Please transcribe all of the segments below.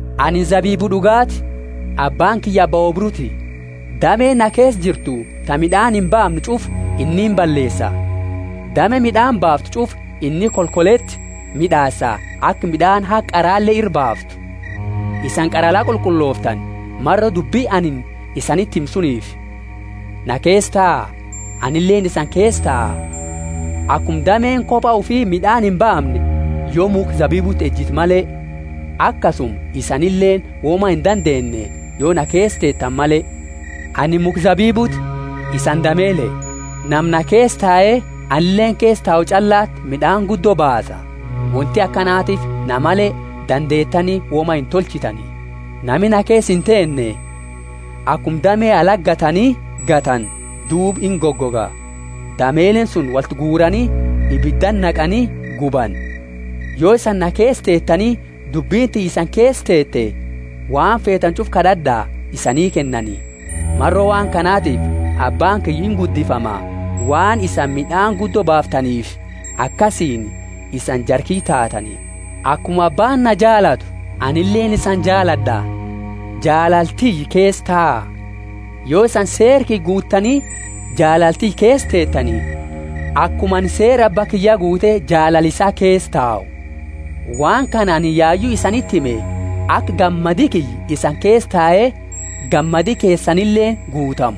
Anini zabibu d'ugaati, Abbaani kiyya abba oobruuti. Dame na keesa jirtu ta mid'aani imbaamne ch'ufa inni imballeesa, dame mid'aani baaftu ch'ufa inni kolkoleti mid'aasa aka mid'aani haga qarale ira baaftu. Isani qara la qulqullooftani, maro dubbi anini isaniti hime suniifi. Na keesa taa, anileeni isani keesa taa. Akuma dameeni koba ufi mid'aani imbaamne, yo mukha zabibuti ejitu male, akasuma isanileeni woma indandeenne, yo na keesa teetani male. Anini mukha zabibuti, isani damele. Nama na keesa tae anileeni keesa tau ch'allati mid'aani guddo baasa; wonti akanatiifi na male dandeetani woma intolchitani. Nami na keesa inteenne, akuma dame alati gatani, gatani duuba ingoga; damele suni wolti guurani ibidati naqani gubani. Yo isani na keesa teetani dubbini tiyya isani keesa teete, waan feetani ch'ufa kad'ad'a, isanii kennani. Maro waan kanatifi Abbaani kiyya inguddifama, waan isani mid'aani guddo baaftaniifi; akasiini isani jara kiyya taatani. Akuma Abbaani na jaalatu, anileeni isani jaalad'a; jaalala tiyya keesa taa. Yo isani seera kiyya guuttani jaalala tiyya keesa teetani, akuma anini seera Abba kiyya guute jaalala isaa keesa tau. Waan kana anini yayu isaniti hime aka gammadi kiyya isani keesa tae gammadi keesanileeni guutamu.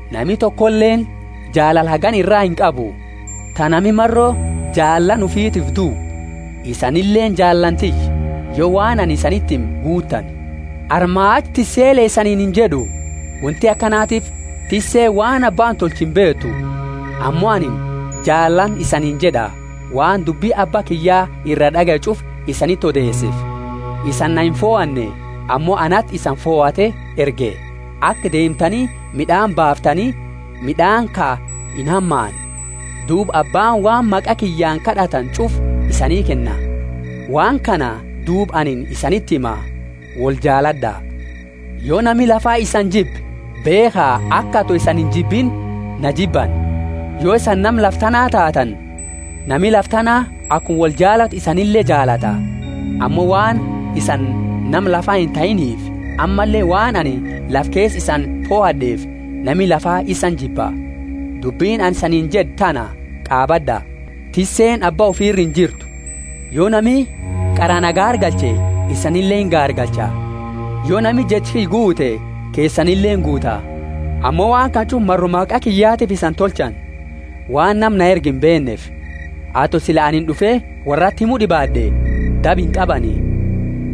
Nami tokoleeni jaalala hagana ira inqabu, ta nami maro jaalaani ufitiifi duu. Isanileeni jaalani tiyya, yo waan anini isaniti hime guuttani. Armaa achi tissele isaniini injed'u; wonti akanatiifi tisseeni waan abbaani tolchu imbeetu. Ammo anini jaalaani isaniini jed'a, waan dubbi Abba kiyya iraa d'agaye ch'ufa isaniti odeeseefi. Isani na imfohanne, ammo anati isani fohate erge, aka deemtani mid'aani baaftani, mid'aani ka inhamaanne. Duuba Abbaani waan maqa kiyyaani kad'attani ch'ufa isanii kenna. Waan kana duuba anini isaniti hima: woljaalad'a. Yo nami lafa isani jibbe, beekha aka, ato isani injibiini, na jibbani. Yo isani nama lafa tanaa taatani, nami lafa tana akuma woljaalatu isanile jaalata. Ammo waan isani nama lafaa intahiiniifi ammalle waan anini lafa keesa isani fohad'eefi, nami lafaa isani jibba. Dubbi anini isaniini jed'e tana qaabad'a: Tisseeni abba ufi ira injirtu. Yo nami qara na gaargalche, isanile ingaargalcha; yo nami jecha kiyya guute, keesanile inguuta. Ammo waan kana ch'ufa maro maqa kiyyatiifi isani tolchani, waan nama na erge imbeenneefi. Ato sila anini d'ufe worrati himu d'ibaad'e, daba inqabani;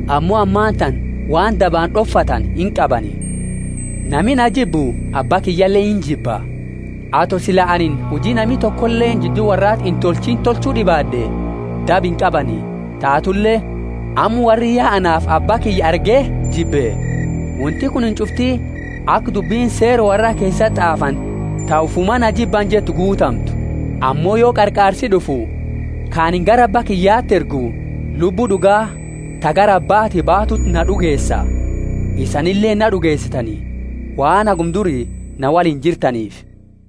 ammo ammatana waan dabaani d'ofatani inqabani. Nami na jibbu Abba kiyyale injiba. Ato sila anini huji nami tokoleeni jiddu worrati intolchiini tolchu d'ibaad'e, daba inqabani; taatule amma worri ya anaafi Abba kiyya arge jibbe. Wonti kunini ch'ufti aka dubbini Seera worraa keesati t'aafani ta, ufumaa na jibbani jettu guutamtu. Ammo yo Qarqaarsi d'ufu, ka anini gara Abba kiyyati ergu, Lubbu d'uga, ta gara Abbati baatuuti na d'ugeesa. Isanileeni na d'ugeesitani, waan haguma duri na woliini jirtaniifi.